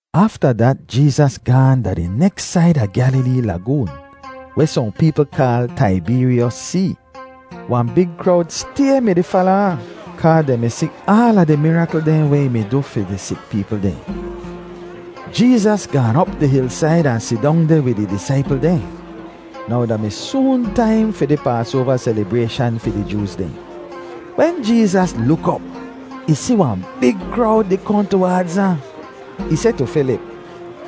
Afta dat Jeezas gaahn da di neks said a Gyalilee Lagoon, weh sohn peepl kaal Taibeeryos See. Wahn big krowd stay mi-di fala ahn kaa dehn mi si aala di mirakl dehn weh ih mi du fi di sik peepl dehn. Jeezas gaan op di hilsaid ahn sidong deh wid ih disaipl dehn. Now da mi soon taim fi di Paasoava selibrayshan fi di Jooz dehn. Wen Jeezas luk op, ih si wahn big krowd di kohn tuwaadz ahn. Ih seh tu Filip,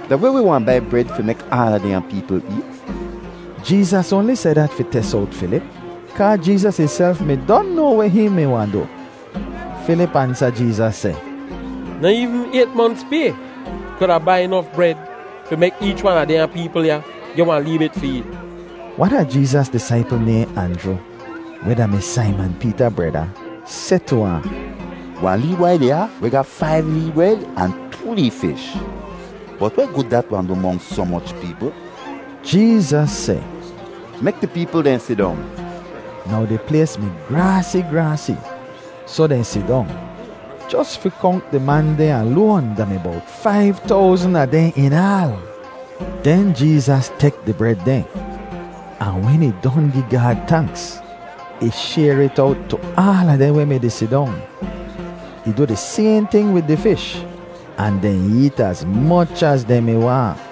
“Da weh wi wahn bai bred fi mek aala dehnya peepl eet?” Jeezas oanli seh dat fi tes owt Filip, kaa Jeezas ihself mi don noa weh hihn mi wahn du. Filip ansa Jeezas seh, “Noh eevn ayt monts pay kuda bai nof bred fi mek eech wan a dehnya peepl ya geh wahn lee bit fi eet.” Wan a Jeezas disaipl nayhn Anjru, weh da-mi Saiman Peeta breda, seh tu ahn, “Wahn lee bwai deh ya weh ga faiv lee bred ahn too lee fish. Bot weh gud dat wahn du monks soh moch peepl?” Jeezas seh, “Mek di peepl dehn sidong.” Now di plays mi graasi, graasi, soh dehn sidong. Jos fi konk di man dehn aloan da mi bowt faiv towzn a dehn in aal. Den Jeezas tek di bred dehn, ahn wen ih don gi Gaad tanks, ih shayr it owt tu aala dehn weh mi-di sidong; ih du di sayhn ting wid di fish, ahn dehn eet az moch az dehn mi waahn.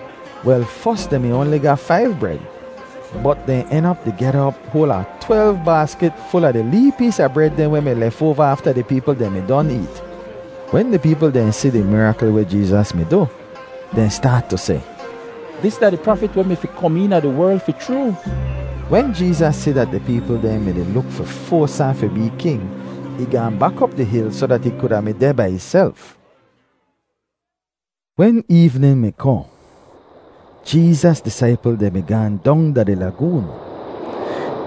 Wel, fos dehn mi oanli ga faiv bred, bot dehn en op di gyada op hoal a twelv baaskit ful a di lee pees a bred dehn weh mi lefoava afta di peepl dehn mi don eet. Wen di peepl dehn si di mirakl weh Jeezas mi du, dehn staat tu seh, “Dis da di Prafit weh mi fi kom eena di werl fi chroo!” Wen Jeezas si dat di peepl dehn mi-di luk fi foas ahn fi bee king, ih gaahn bak op di hil soh dat ih kuda mi deh bai ihself. Wen eevnin mi kohn, Jeezas disaipl dehn mi gaahn dong da di lagoon.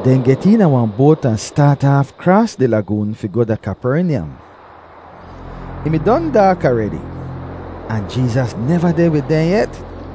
Dehn get eena wahn boat ahn staat aaf kraas di lagoon fi goh da Kapernyam. Ih mi don daak aredi, ahn Jeezas neva deh wid dehn yet.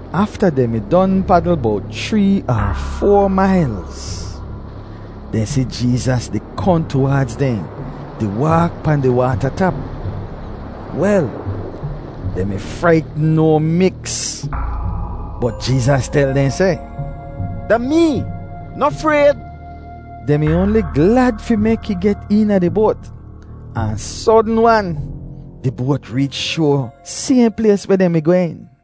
Afta dehn mi don padl bowt chree er foa mailz, dehn si Jeezas di kohn tuwaadz dehn di waak pahn di waata tap. Wel, dehn mi fraitn no miks. Bot Jeezas tel dehn seh, “Da mee. Noh frayd.” Dehn mi oanli glad fi mek ih get eena di boat, ahn sodn-wan, di boat reech shoa sayhn plays weh dehn mi gwehn.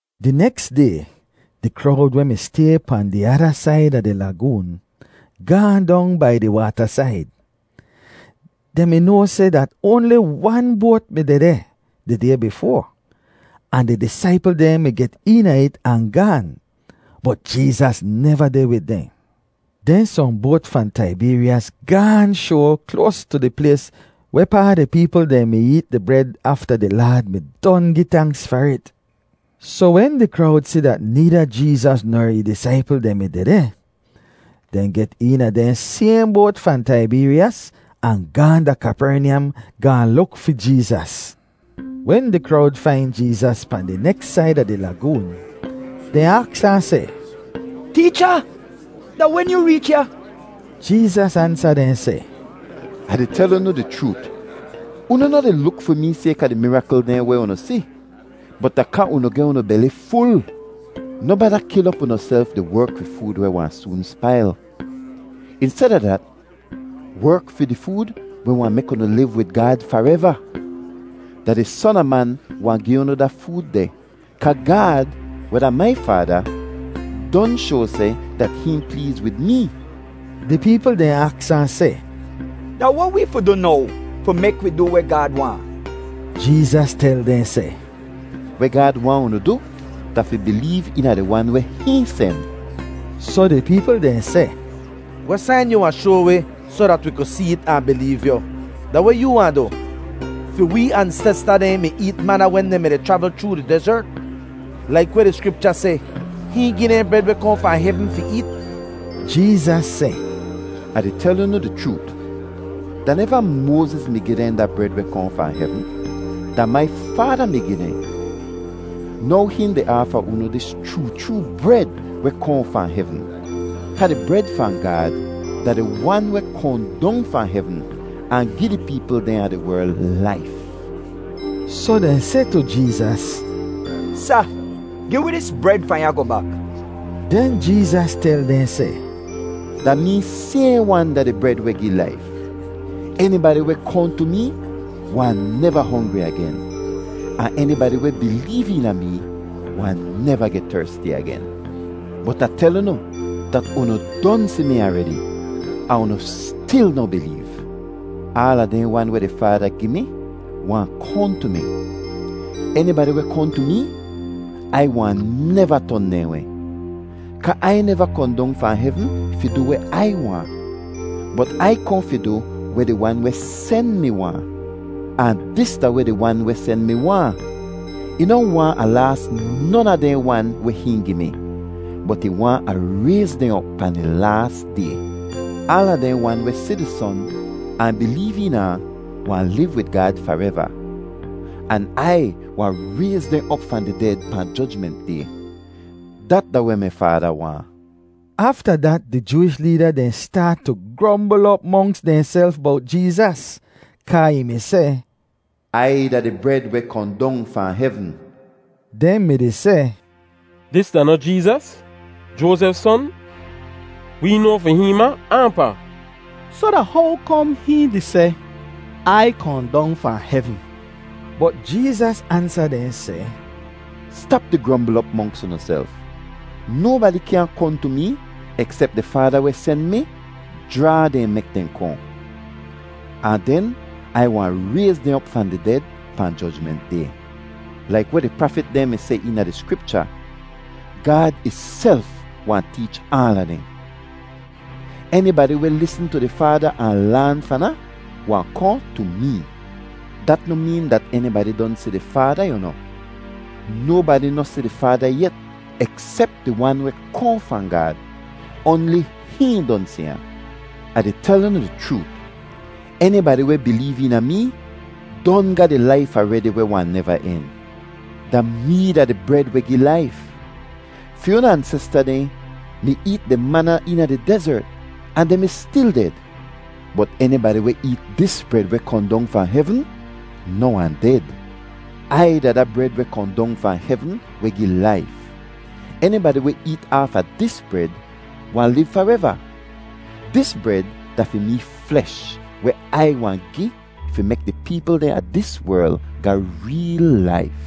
Di neks day, di krowd weh mi stay pahn di ada said a di lagoon gaahn dong bai di waatasaid. Dehn mi noa seh dat oanli wan boat mi dehdeh di day bifoa, ahn di disaipl dehn mi get eena it ahn gaan, bot Jeezas neva deh wid dehn. Den sohn boat fahn Taibeeryos gaahn shoa kloas tu di plays wehpaa di peepl dehn mi eet di bred afta di Laad mi don gi tanks far it. Soh wen di krowd si dat needa Jeezas ner ih disaipl dehn mi dehdeh, dehn get eena dehn sayhn boat fahn Taibeeryos ahn gaahn da Kapernyam gaahn luk fi Jeezas. Wen di krowd fain Jeezas pahn di neks said a di lagoon, dehn aks ahn seh, “Teecha, da wen yoo reech ya?” Jeezas ansa dehn seh, “Ah di tel unu di chroot, unu noh di luk fi mee sayka di mirakl dehn weh unu si, bot da kaa unu geh unu beli ful. Noh bada kil op unuself di werk fi food weh wahn soon spail; insteda dat, werk fi di food weh wahn mek unu liv wid Gaad fareva. Da di Son a Man wahn gi unu da food deh kaa Gaad, weh da mai Faada, don shoa seh dat hihn pleez wid mee.” Di peepl dehn aks ahn seh, “Da weh wee fi du now fi mek wi du weh Gaad waahn?” Jeezas tel dehn seh, “Weh Gaad waahn unu du, da fi bileev eena di Wan weh hihn sen.” Soh di peepl dehn seh, “Weh sain yu wahn shoa wi soh dat wi ku see't ahn bileev yu? Da weh yoo wahn du? Fi wee ansesta dehn mi eet mana wen dehn mi-di chravl chroo di dezert. Laik weh di Skripcha seh, ‘Hihn gi dehn bred weh kohn fahn hevn fi eet.’” Jeezas seh, “Ah di tel unu di chroot, da neva Moaziz mi gi dehn da bred weh kohn fahn hevn; da mai Faada mi gi dehn. Now hihn di aafa unu dis chroo chroo bred weh kohn fahn hevn. Kaa di bred fahn Gaad da di Wan weh kohn dong fahn hevn ahn gi di peepl dehn a di werl laif.” Soh dehn seh tu Jeezas, “Sa, gi wi dis bred fahn ya goh bak.” Den Jeezas tel dehn seh, “Da mee sayhn wan da di bred weh gi laif. Enibadi weh kohn tu mee wahn neva hongri agen, ahn enibadi weh bileev eena mee wahn neva geh tersti agen. Bot Ah tel unu dat unu don si mi aredi, ahn unu stil noh bileev. Aala dehn wan weh di Faada gi mi wahn kohn tu mi; enibadi weh kohn tu mee, Ai wahn neva ton dehn weh. Kaa Ai neva kohn dong fahn hevn fi du weh Ai waahn, bot Ai kohn fi du weh di Wan weh sen mi waahn. Ahn dis da weh di Wan weh sen mi waahn: Ih noh waahn Ah laas non a dehn wan weh hihn gi mi, bot ih waahn Ah rayz dehn op pahn di laas Day. Aala dehn wan weh si di Son ahn bileev eena ahn wahn liv wid Gaad fareva; an Ai wahn rayz dehn op fahn di ded pahn Jojment Day. Dat da weh mi Faada waahn.” Afta dat di Jooish leeda dehn staat tu grombl op monks dehnself bowt Jeezas kaa ih mi seh, “Ai da di bred weh kohn dong fahn hevn.” Dehn mi-di seh, “Dis da noh Jeezas, Joazef son? Wee noa fi hihn ma ahn pa. Soh da how kom hihn di seh, ‘Ai kohn dong fahn hevn’?” Bot Jeezas ansa dehn seh, “Stap di grombl op monks unuself. Nobadi kyaahn kohn tu mee, eksep di Faada weh sen mi jraa dehn mek dehn kohn; ahn den Ai wahn rayz dehn op fahn di ded pahn Jojment Day. Laik weh di prafit dehn mi seh eena di Skripcha, ‘Gaad ihself wahn teech aala dehn.’ Enibadi weh lisn tu di Faada ahn laan fahn ahn wahn kohn tu mee. Dat noh meen dat enibadi don si di Faada, yu noh. Nobadi noh si di Faada yet eksep di Wan weh kohn fahn Gaad; oanli hihn don si ahn. “Ah di tel unu di chroot, enibadi weh bileev eena mee don ga di laif aredi weh wahn neva en. Da mee da di bred weh gi laif! Fi unu ansesta dehn mi eet di mana eena di dezert ahn dehn mi stil ded. Bot enibadi weh eet dis bred weh kohn dong fahn hevn noh wahn ded. Ai da da bred weh kohn dong fahn hevn weh gi laif. Enibadi weh eet aafa dis bred wahn liv fareva; dis bred da fi mee flesh weh Ai wahn gi fi mek di peepl dehn a dis werl ga reel laif.”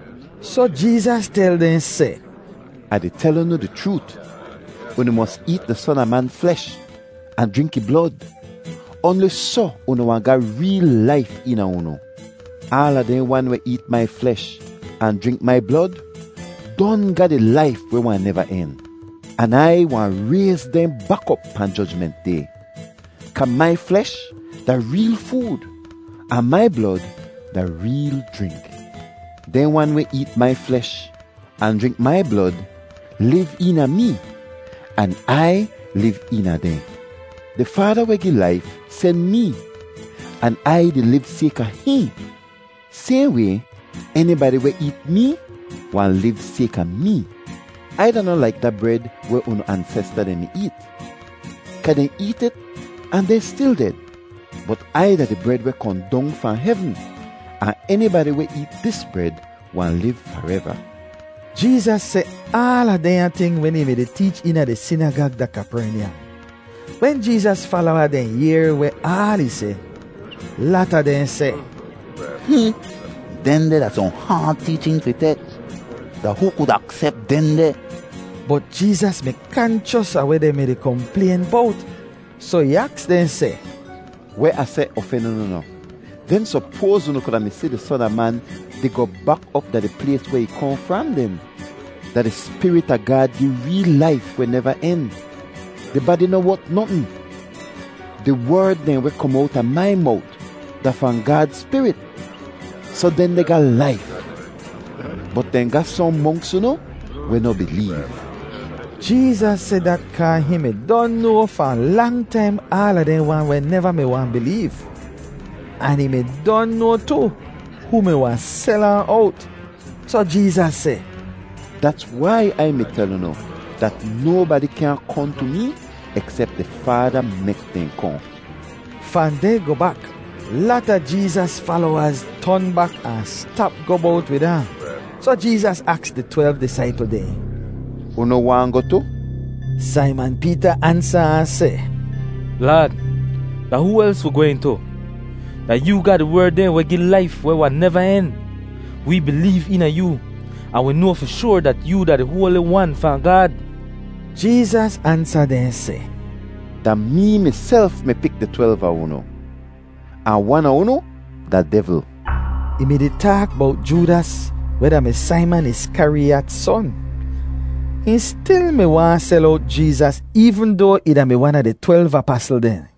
Soh Jeezas tel dehn seh, “Ah di tel unu di chroot, unu mos eet di Son a Man flesh ahn jrink ih blod; oanli soh unu wahn ga reel laif eena unu. Aala dehn wan weh eet mai flesh ahn jrink mai blod don ga di laif weh wahn neva en, an Ai wahn rayz dehn bak op pahn Jojment Day; kaa mai flesh da reel food, ahn mai blod da reel jrink. Dehn wan weh eet mai flesh ahn jrink mai blod liv eena mee, an Ai liv eena dehn. Di Faada weh gi laif sen mee an Ai di liv sayka hihn. Sayhn way, enibadi weh eet mee wahn liv sayka mee. Ai da noh laik da bred weh unu ansesta dehn mi eet, kaa dehn eet it ahn dehn stil ded. Bot Ai da di bred weh kohn dong fahn hevn, ahn enibadi weh eet dis bred wahn liv fareva.” Jeezas seh aala dehnya ting wen ih mi-di teech eena di sinagag da Kapernyam. Wen Jeezas falowa dehn yehr weh aal ih seh, lata dehn seh, “Hmm, dehndeh da sohn haad teechin fi tek. Da hoo ku aksep dehndeh?” Bot Jeezas mi kanchos a weh dehn mi-di komplayn bowt, soh ih aks dehn seh, “Weh Ah seh ofen unu noh? Den sopoaz unu kuda mi si di Son a Man di goh bak op da di plays weh ih kohn fram den? Da di Spirit a Gaad gi reel laif weh neva en; di badi noh wot notn. Di werd dehn weh kom owta mai mowt da fahn Gaad Spirit, soh dehndeh ga laif! Bot dehn ga sohn monks unu weh noh bileev.” Jeezas seh dat kaa hihn mi don noa fahn lang taim aala dehn wan weh neva mi wahn bileev, ahn hihn mi don noa tu, hoo mi wahn sel ahn owt. Soh Jeezas seh, “Dats wai Ai mi tel unu dat nobadi kyaahn kohn tu mee eksep di Faada mek dehn kohn.” Fahn deh goh bak, lata Jeezas falowaz ton bak ahn stap goh bowt wid ahn. Soh Jeezas aks di twelv disaipl dehn, “Unu waahn goh tu?” Saiman Peeta ansa ahn seh, “Laad, da hoo els wi gwehn tu? Da yoo ga di werd dehn weh gi laif weh wahn neva en. Wee bileev eena yoo, ahn wi noa fi shoar dat yoo da di Hoali Wan fahn Gaad.” Jeezas ansa dehn seh, “Da mee miself mi pik di twelv a unu, ahn wan a unu da devl!” Ih mi-di taak bowt Joodas weh da-mi Saiman Iskariyat son. Hihn stil mi wahn sel owt Jeezas eevn doa ih da-mi wan a di twelv apasl dehn.